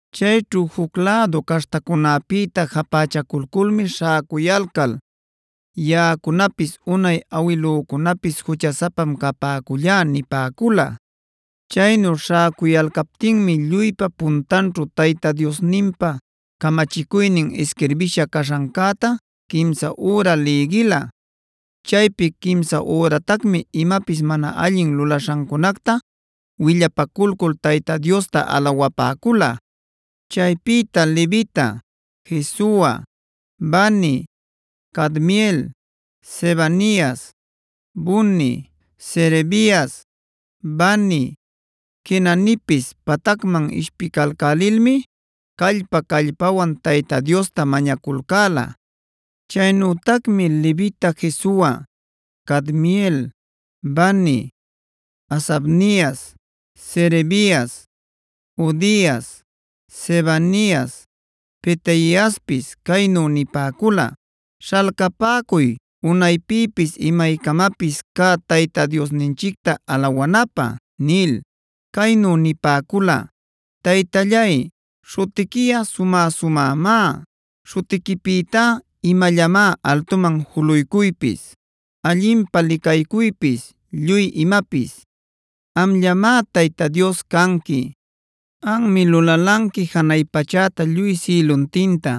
Chayćhu juc lädu caśhtacunäpïtaa japächaculculmi śhäcuyalcal: “Yaꞌacunapis unay awilücunapis juchasapam capäcullá” nipäcula. Chaynu śhäcuyalcaptinmi lluypa puntanćhu Tayta Diosninpa camachicuynin isquirbïsha caśhancäta quimsa üra lïgila. Chaypi quimsa üratacmi imapis mana allin lulaśhancunacta willapaculcul Tayta Diosta alawapäcula. Chaypïta levita Jesua, Bani, Cadmiel, Sebanias, Buni, Serebias, Bani, Quenanipis patacman ishpilcälilmi callpa-callpawan Tayta Diosta mañaculcäla. Chaynütacmi levita Jesua, Cadmiel, Bani, Hasabnias, Serebias, Hodias, Sebanias, Petaiaspis caynu nipäcula: “Śhalcapäcuy unaypïpis imaycamapis cä Tayta Diosninchicta alawanapä” nil. Caynu nipäcula: “Taytallay, śhutiquiꞌa sumä-sumämá; śhutiquipïtá imallamá altuman juluycuypis, allinpä licaycuypis, lluy imapis. “Amllamá Tayta Dios canqui.b Anmi lulalanqui janay pachäta lluy sïluntinta,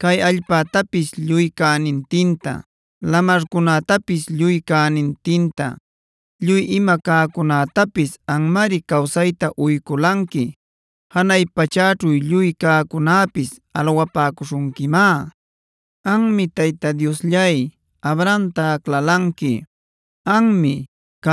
cay allpätapis lluy cänintinta, lamarcunätapis lluy cänintinta. Lluy ima cäcunätapis anmari cawsayta uyculanqui. Janay pachäćhu lluy cäcunäpis alawapäcuśhunquimá. “Anmi Tayta Diosllay, Abramta aclalanqui. Anmi,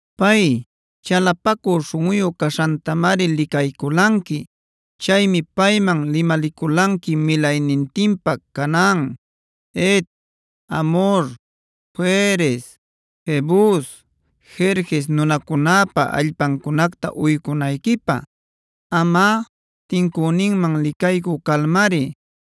Pay, chalapacü śhunꞌuyu caśhantamari licayculanqui. Chaymi payman limaliculanqui milaynintinpa Canaan, Het, Amhor, Ferez, Jebus, Gerges nunacunäpa allpancunacta uycunayquipä. Amꞌa, tincüninman licaycü calmari,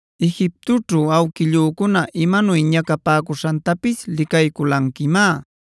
“Egiptoćhu awquillücuna imanuy ñacapäcuśhantapis licayculanquimá;f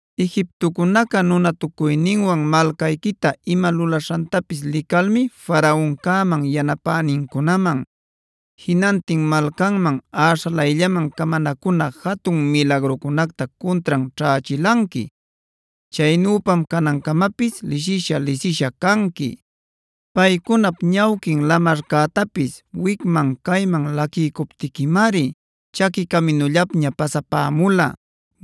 Egiptocunaca nunatucuyninwan malcayquita ima lulaśhantapis licalmi Faraoncäman yanapänincunaman, jinantin malcanmanh äśhalayllaman camanacuna jatun milagrucunacta cuntran ćhächilanqui. Chaynüpam canancamapis lisisha-lisisha canqui. Paycunap ñawquin lamarcätapis wicman cayman laquiycuptiquimari chaqui caminullapña pasapämula.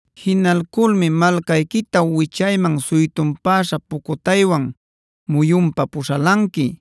Jinalculmi malcayquita wichayman suytunpäśha pucutaywan muyunpa puśhalanqui,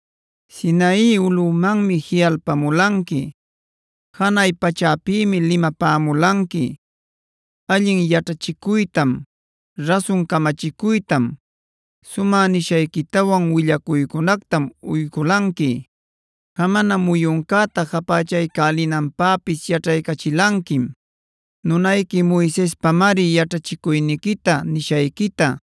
“Sinai ulꞌumanmi jiꞌalpamulanqui; janay pachäpïmi limapämulanqui. Allin yaćhachicuytam, rasun camachicuytam, sumä nishayquitawan willacuycunactam uyculanqui. Jamana muyuncäta japächaycälinanpäpis yaćhaycachilanquim. Nunayqui Moisespamari yaćhachicuyniquita, nishayquita,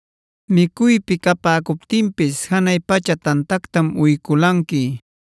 “Micuypi capäcuptinpis janay pacha tantactam uyculanqui.l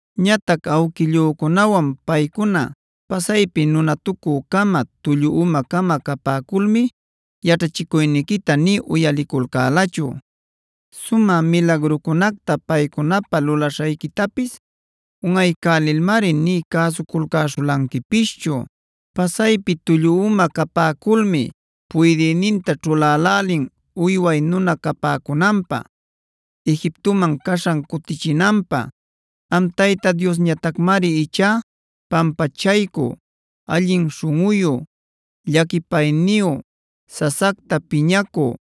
“Ñatac awquillücunawan paycuna pasaypi nunatucü-cama, tullu uma-cama capäculmi yaćhachicuyniquita nï uyaliculcälachu. Sumä milagrucunacta paycunapä lulaśhayquitapis unꞌaycälilmari nï cäsuculcäśhulanquipischu. Pasaypi tullu uma capäculmi puydïninta ćhulälälin uyway nuna capäcunanpä, Egiptoman caśhan cutichinanpä.o Am Tayta Diosñatacmari ichá pampachaycü, allin śhunꞌuyu, llaquipayniyu, sasacta piñacü,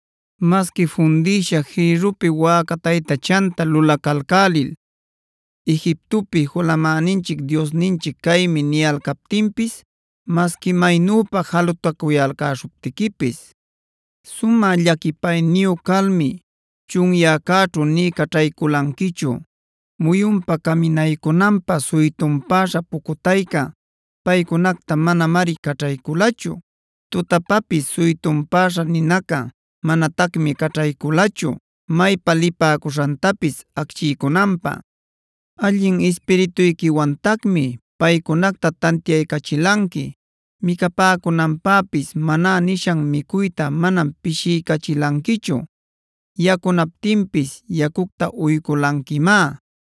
“Masqui fundïsha jïrrupi wäca taytachanta lulacalcälil: ‘Egiptopi julamäninchic diosninchic caymi’ niyalcaptinpis,q masqui maynüpa jalutacuyalcäśhuptiquipis, sumä llaquipayniyu calmi chunyäcäćhu nï caćhayculanquichu. Muyunpa caminaycunanpä suytunpäśha pucutayca paycunacta manamari caćhayculachu. Tutapapis suytunpäśha ninaca manatacmi caćhayculachu, maypa lipäcuśhantapis acchiycunanpä. “Allin Ispirituyquiwantacmi paycunacta tantiaycachilanqui. Micapäcunanpäpis Manárs nishan micuyta manam pishiycachilanquichu; yacunaptinpis yacucta uyculanquimá.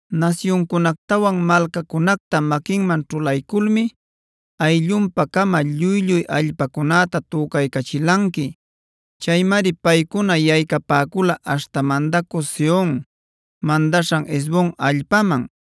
“Nasyuncunactawan malcacunacta maquinman ćhulayculmi ayllunpa-cama lluy-lluy allpacunäta tücaycachilanqui. Chaymari paycuna yaycapäcula aśhta mandacü Sehon mandaśhan Hesbon allpaman;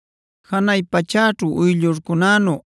Janay pachäćhu uyllurcunänu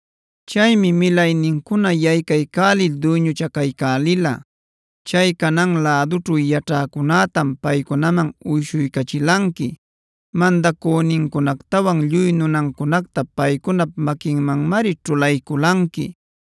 Chaymi milaynincuna yaycaycälil duyñuchacaycälila. Chay Canaan lädućhu yaćhäcunätam paycunaman uyshuycachilanqui. Mandacünincunactawan lluy nunancunacta paycunap maquinmanmari ćhulayculanqui,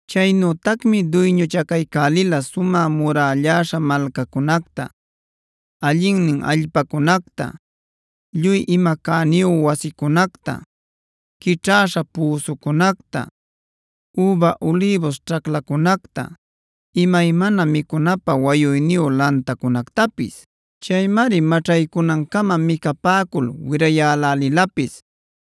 Chaynütacmi duyñuchacaycälila sumä murälläśha malcacunacta, allinnin allpacunacta, lluy ima cäniyu wasicunacta, quićhäśha püsucunacta, üba ulïbus ćhaclacunacta, imaymana micunapä wayuyniyu lantacunactapis. Chaymari maćhaycunancama micapäcul wirayälälilapis.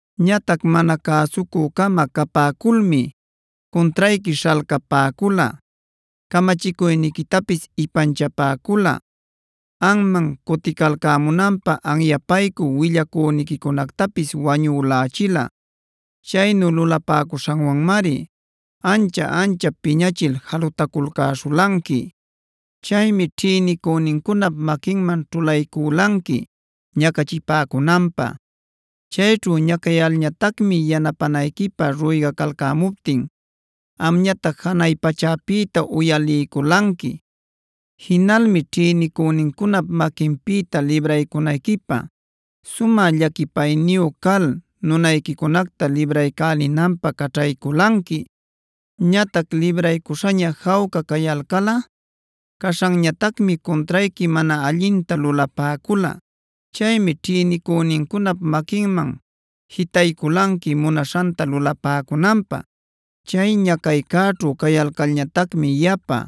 “Ñatac mana cäsucü-cama capäculmi cuntrayqui śhalcapäcula, camachicuyniquitapis ipanchapäcula, anman cuticalcämunanpä anyapaycü willacüniquicunactapis wañülächila. Chaynu lulapäcuśhanwanmari ancha-anchap piñachil jalutaculcäśhulanqui. Chaymi ćhïnicünincunap maquinman ćhulaycülanqui ñacachipäcunanpä. Chayćhu ñacayalcalñatacmi yanapänayquipä ruygacalcämuptin amñatac janay pachäpïta uyaliyculanqui. Jinalmi ćhïnicünincunap maquinpïta libraycunayquipä sumä llaquipayniyu cal nunayquicunacta libraycälinanpä caćhayculanqui. Ñatac libraycuśhaña jawca cayalcalꞌa caśhanñatacmi cuntrayqui mana allinta lulapäcula. Chaymi ćhïnicünincunap maquinman jitaycülanqui munaśhanta lulapäcunanpä. Chay ñacaycäćhu cayalcalñatacmi yapa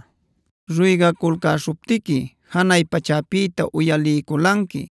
ruygaculcäśhuptiqui janay pachäpïta uyaliyculanqui.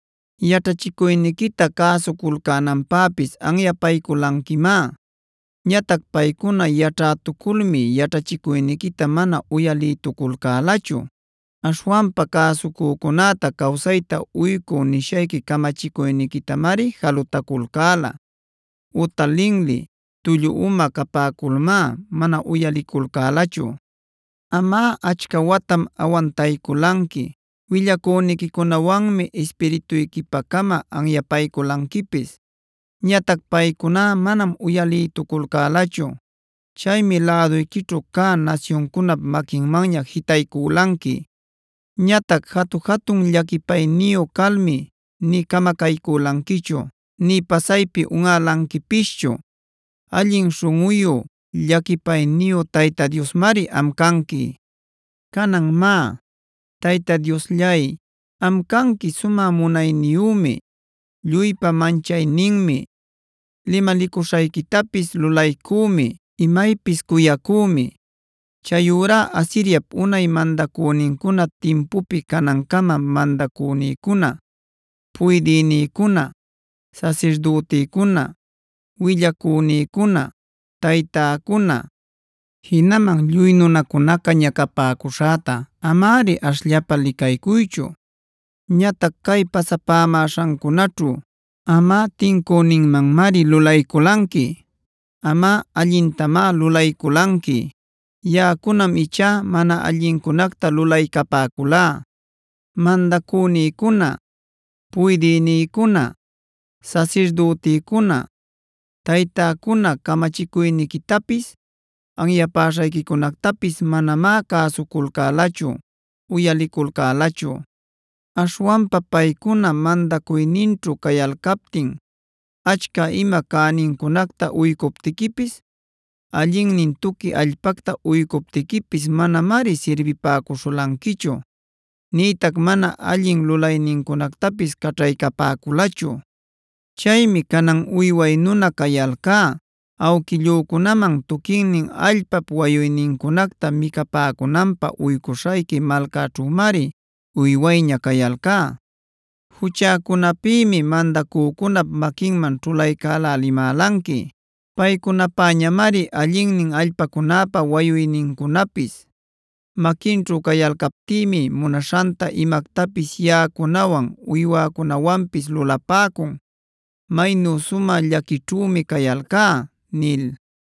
Yaćhachicuyniquita cäsuculcänanpäpis anyapayculanquimá. Ñatac paycuná yaćhätuculmi yaćhachicuyniquita mana uyalïtuculcälachu.z Aśhwanpa ‘cäsucücunäta cawsayta uycü’ nishayqui camachicuyniquitamari jalutaculcäla. Uta linli, tullu uma capäculmá mana uyaliculcälachu. “Amꞌa achca watam awantayculanqui. Willacüniquicunawanmi Ispirituyquipacama anyapayculanquipis. Ñatac paycuná manam uyalïtuculcälachu.a Chaymi läduyquićhu cä nasyuncunap maquinmanña jitaycülanqui. Ñatac jatu-jatun llaquipayniyu calmi nï camacaycülanquichu, nï pasaypi unꞌälanquipischu. Allin śhunꞌuyu, llaquipayniyu Tayta Diosmari am canqui. “Canan má, Tayta Diosllay, am canqui sumä munayniyümi, lluypa manchayninmi, limalicuśhayquitapis lulaycümi, imaypis cuyacümi. Chayurá Asiriapb unay mandacünincuna timpupi canancama mandacünïcuna, puydïnïcuna, sasirdütïcuna, willacünïcuna, taytäcuna, jinaman lluy nunacunaca ñacapäcuśhäta amari ashllapa licaycuychu. Ñatac cay pasapämäśhancunaćhu amꞌa tincüninmanmari lulayculanqui. Amꞌa allintamá lulayculanqui; yaꞌacunam ichá mana allincunacta lulaycapäculá. Mandacünïcuna, puydïnïcuna, sasirdütïcuna, taytäcuna camachicuyniquitapis, anyapäśhayquicunactapis manamá cäsuculcälachu, uyaliculcälachu. Aśhwanpa paycuna mandacuyninćhu cayalcaptin achca ima cänincunacta uycuptiquipis, allinnin tuqui allpacta uycuptiquipis manamari sirbipäcuśhulanquichu, nïtac mana allin lulaynincunactapis caćhaycapäculachu. “Chaymi canan uyway nuna cayalcá. Awquillücunaman tuquinnin allpap wayuynincunacta micapäcunanpä uycuśhayqui malcaćhümari uywayña cayalcá. Juchäcunapïmi mandacücunap maquinman ćhulaycälälimälanqui. Paycunapäñamari allinnin allpacunäpa wayuynincunapis. Maquinćhu cayalcaptïmi munaśhanta imactapis yaꞌacunawan uywäcunawanpis lulapäcun. Maynu sumä llaquićhümi cayalcá” nil.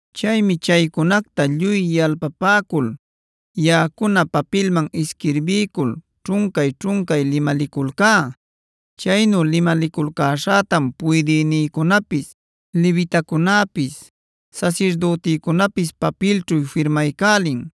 Chaymi chaycunacta lluy yalpapäcul yaꞌacuna papilman isquirbiycul ćhuncay-ćhuncay limaliculcá. Chaynu limaliculcäśhätam puydïnïcunapis, levitacunäpis, sasirdüticunäpis papilćhu firmaycälin.